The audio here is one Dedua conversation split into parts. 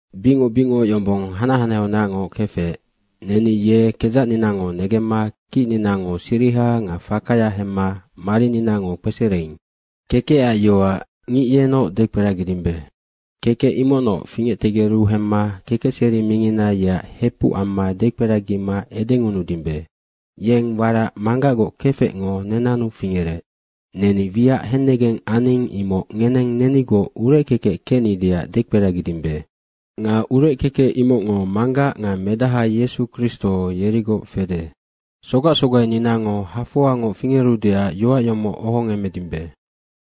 Bicngoc bicngoc yombong hanac hanaheaunacngoc kefec, neni ye kedzacninango negemma kicninango siriha nga fakaya hemma marininango kpesereing. Kekecac Yoac, ngic yenoc dekperagidimbe. Kekec imocnoc fingectegeru hemma kekecseri mingina yeac hepuc amma dekperagima edengunudimbe. Yeng warac Manggacgoc kefecngo nenannu fingerec. Neni wiac hennegeng aning, imoc ngeneng nenigoc urec kekec kecnideac dekperagidimbe. Nga urec kekec, imocngo Manggac nga Medaha Yesu Kristo, yerigoc fede. Sogac sogaininango hafoangoc fingerudeac yoac yomoc ohongemmedimbe.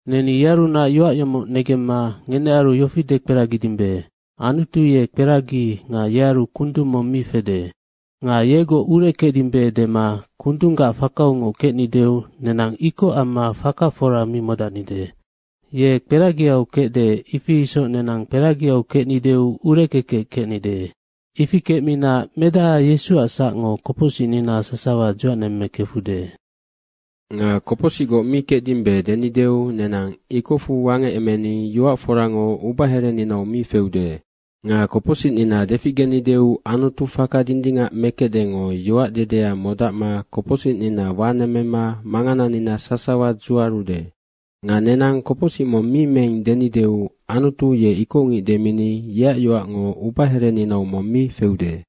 Neni yearunac yoac yomoc negemma ngenearu yofi dekperagidimbe, Anutu ye kperagi nga yearu kundung mong mi fede. Nga yegoc urec kecdimbe dema kundunggac fakaungoc kecnideu nenang ikoc amma faka fora mi modacnide. Ye kperagiau kecde, ifi isoc nenang kperagiau kecnideu, ureckekec kecnide. Ifi kecmina medaha Yesuac sacngo kopocsicnina sasawa dzuacnemmekefude. Nga kopocsicgoc mi kecdimbe denideu nenang ikocfu wangecemeni yoac forango ubahereninau mi feude. Nga kopocsicnina deficgenideu Anutu faka dindingac mekecdengo yoac dedea modacma kopocsicnina wanemmema mangananina sasawa dzuarude. Nga nenang kopocsic mong mi meing denideu Anutu ye ikocngic demini yeac yoacngo ubahereninau mong mi feude.